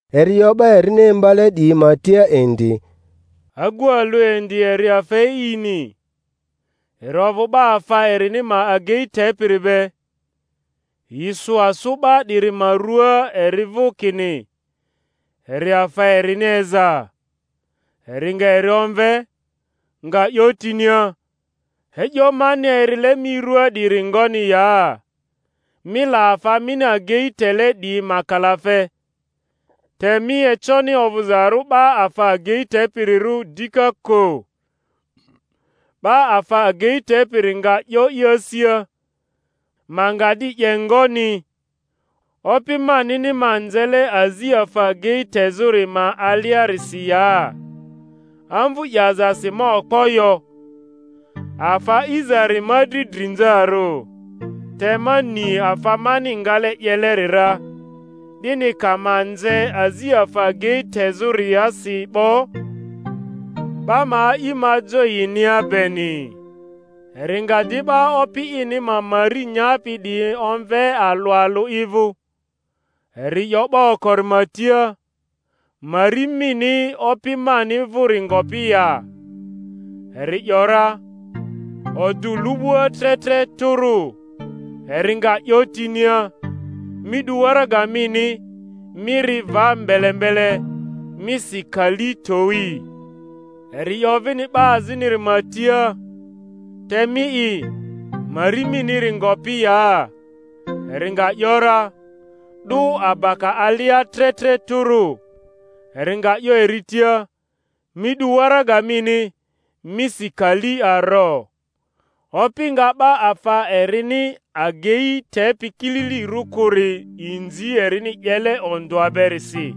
Eri 'yo 'ba erini imbale 'diyi ma tia indi, Agu alᴜ indi eri afa e'ini, eri ovᴜ 'ba afa erini ma agei tepiri be; yi sᴜ asᴜ 'ba 'diri ma ruaa eri vᴜ kini eri afa erini eza. Eri nga eri omve, nga 'yo tinia, E'yo mani erile mi ruaa 'diri ngoni ya? Mi la afa mini agemi tele 'diyi ma kalafe, te mi econi ovᴜzarᴜ 'ba afa agei tepirirᴜ dika kᴜ. 'Ba afa agei tepiri nga 'yo i asia, Ma nga di 'ye ngoni, opi manini ma nzele azi afa agei tezᴜri ma aliarisi ya? Amvu 'yazasi ma okpo yo; afa a'izari ma dri drinzarᴜ. Te ma ni afa mani ngale 'yeleri ra, 'dini ka ma nze azi afa agei tezᴜriasi 'bo, 'ba ma a'i ma jo yinia beni. Eri nga di 'ba opi ini ma mari nyapi 'diyi omve alᴜ alᴜ i vᴜ, eri 'yo 'ba okori ma tia, Mari mini opi mani vᴜri ngopi ya? Eri ‘yora, Odᴜ lu'bua tre tre tᴜrᴜ. Eri nga 'yo tinia, Mi 'du waraga mini, mi ri va mbele mbele, mi si kali towi. Eri 'yo vini 'ba aziniri ma tia, Te mi'i, mari miniri ngopi ya? Eri nga ‘yora, 'Dᴜ abaka alia tre tre tᴜrᴜ. Eri nga 'yo eri tia, Mi 'du waraga mini, mi si kali aro. Opi nga 'ba afa erini agei tepi kililirᴜ kᴜri inzi erini 'yele ondᴜa berisi;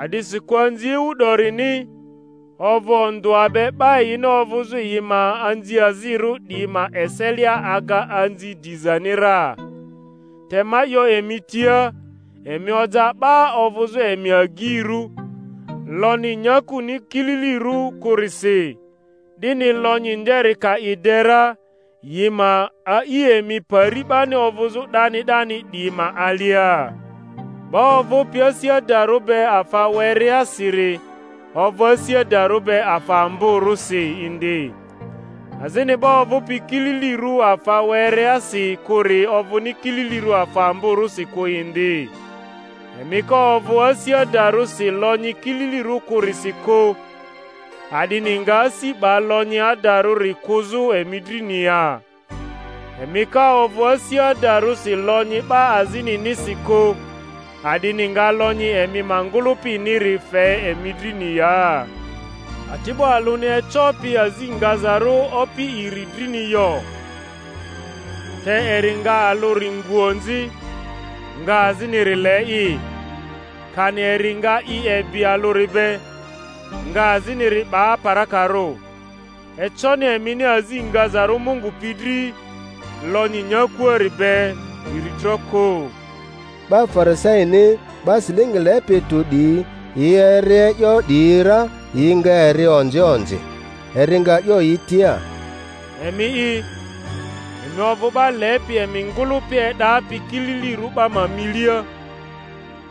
a'disikᴜ anzi ewu 'dorini ovᴜ ondᴜa be 'ba yini ovᴜzᴜ yi ma anziazirᴜ 'diyi ma eselia aga anzi dizani ra. Te ma 'yo emi tia, Emi oja 'ba ovᴜzᴜ emi agyirᴜ, lonyi nyakuni kililirᴜ kᴜrisi, 'dini lonyi nderi ka i de ra, yi ma a'i emi pari 'bani ovᴜzᴜ 'dani 'dani 'diyi ma alia. 'Ba ovᴜpi asi adarᴜ be afa wereasiri ovᴜ asi adarᴜ be afa amborᴜsi indi; azini 'ba ovᴜpi kili-lirᴜ afa wereasi kᴜri ovᴜni kililirᴜ afa amborᴜsi kᴜ indi. Emi ka ovᴜ asi adarᴜsi lonyi kililirᴜ kᴜrisi kᴜ, a'dini nga asi 'ba lonyi adarᴜri kᴜzᴜ emi drini ya? Emi ka ovᴜ asi adarᴜsi lonyi 'ba azininisi kᴜ, a'dini nga lonyi emi ma ngᴜlᴜpiniri fe emi drini ya? Ati'bo alᴜni ecopi azi ngazarᴜ opi iri drini yo; te eri nga alᴜri ngu onzi, nga aziniri le'i, kani eri nga i ebi alᴜri be, nga aziniri 'ba aparakarᴜ. Econi emini azi ngazarᴜ Mungu pi dri, lonyn nyakuari be iritro kᴜ. 'Ba Farisaini, 'ba silingi lepi tᴜ 'diyi, yi eri e'yo 'diyi ra, yi nga eri onzi onzi. Eri nga 'yo yi tia, Emi'i, emi ovᴜ 'ba lepi emi ngᴜlᴜpi e'dapi kililirᴜ 'ba ma milia,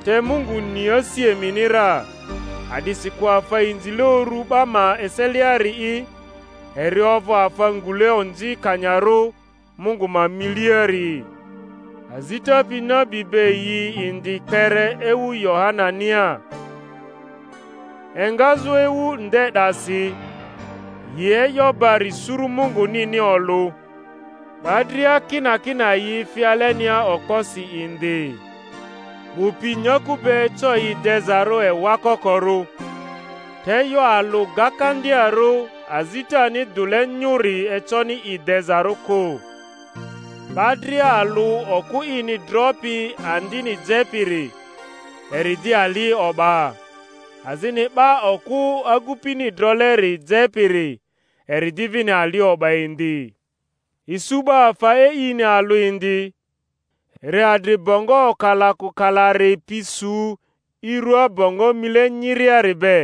te Mungu ni asi emini ra; a'disikᴜ afa inzile uru 'ba ma eseliari'i eri ovᴜ afa ngule onzikanyarᴜ Mungu ma miliari. Azita pi nabi be yi indi kpere ewu Yohanania; engazᴜ ewu nde 'dasi yi e'yo bari suru Mungunini olᴜ, 'ba dria kinakina yi fi alenia okposi indi. 'Bu pi nyaku be eco yi dezarᴜ ewa kokorᴜ, te e'yo alᴜ gakandiarᴜ azitani dᴜle nyᴜri econi i dezarᴜ kᴜ. 'Ba dria alᴜ okᴜ ini dropi andini jepiri, eri 'di ali o'ba; azini 'ba okᴜ agupini droleri jepiri, eri 'di vini ali o'ba indi. Isu 'ba afa e'ini alᴜ indi, eri adri bongo okalakokalari pi su i ruaa bongo mile nyiriari be,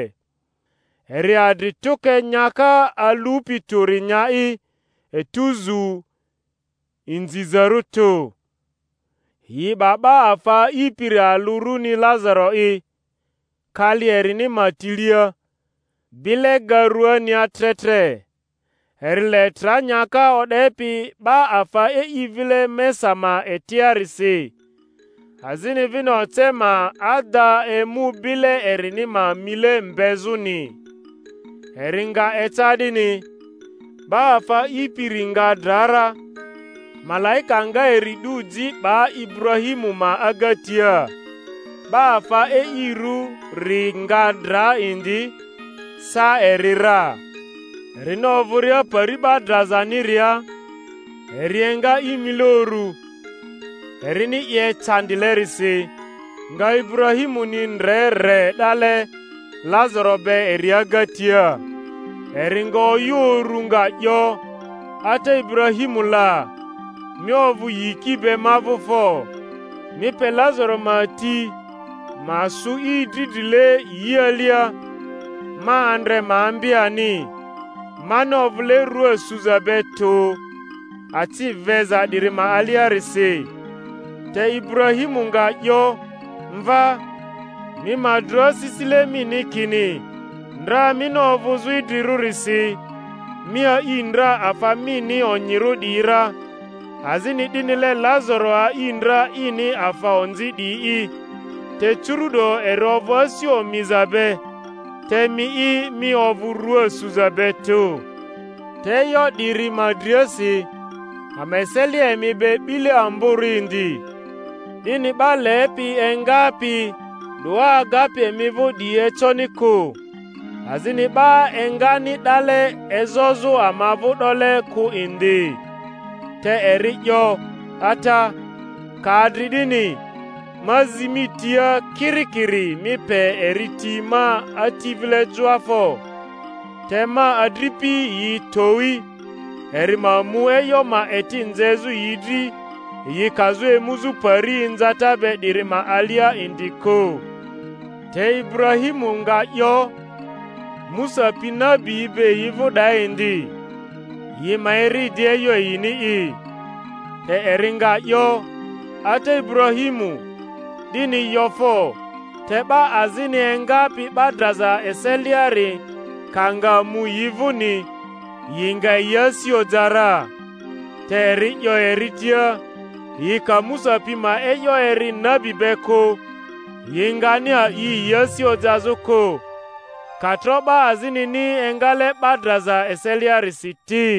eri adri tᴜke nyaka alupi tᴜri nya'i etuzu inzizarᴜ tᴜ. Yi 'ba 'ba afa a'ipiri alᴜ runi Lazaro'i kali erini ma tilea, bile ga rᴜania tre tre, eri le tra nyaka o'depi 'ba afa e'i vile mesa ma etiarisi; azini vini oce ma ada emu bile erini ma mile mbezᴜni. Eri nga eca 'dini, 'ba afa a'ipiri nga dra ra, malaika nga eri 'du ji 'ba Iburahimu ma agatia. 'Ba afa e'irᴜri nga dra indi, sa eri ra; erini ovᴜria Pari 'ba drazaniria eri enga i mile urᴜ, erini i ecandilerisi, nga Iburahimuni ndre re 'dale Lazaro be eri agatia. Eri nga oyᴜ uru nga 'yo, Ata Iburahimu la! mi ovᴜ yiki be ma vᴜ fo, mi pe Lazaro ma ti ma sᴜ i dridrile yi alia, ma andre ma ambi ani; mani ovᴜle rua suza be tᴜ acyi veza 'diri ma aliarisi. Te Iburahimu nga 'yo, Mva, mi ma dro asisile mini kini ndra mini ovᴜzᴜ idrirᴜrisi mi a'i ndra afa mini onyirᴜ 'diyi ra, azini 'dinile Lazaro a'i ndra ini afa onzi 'diyi'i; te curu’do eri ovᴜ asi omiza be, te mi'i, mi ovᴜ rᴜa suza be tᴜ. Te e'yo 'diri ma driasi, ama eselia emi be 'bile amborᴜ indi, 'dini 'ba lepi engapi 'doa agapi emi vᴜ 'diyi econi kᴜ, azini 'ba engani 'dale ezozᴜ ama vᴜ 'dole kᴜ indi. Te eri 'yo, Ata, ka adri 'dini, ma zi mi tia, kirikiri mi pe eri ti ma ati vile joa fo! te ma adripi yi towi, eri ma mu e'yo ma eti nzezᴜ yi dri yi kazᴜ emuzᴜ pari inzata be 'diri ma alia indi kᴜ. Te Iburahimu nga 'yo, Musa pi nabiyi be yi vᴜ 'daa indi; yi ma eri di e'yo yini'i. Te eri nga 'yo, Ata Iburahimu, 'dini yo fo! te 'ba azini engapi 'ba draza eseliari ka nga mu yi vᴜni, yi nga yi asi oja ra. Te eri 'yo eri tia, Yi ka Musa pi ma e'yo eri nabi be kᴜ, yi ngani a'i yi asi ojazᴜ kᴜ, ka tro 'ba azinini engale 'ba draza eseliarisi ti.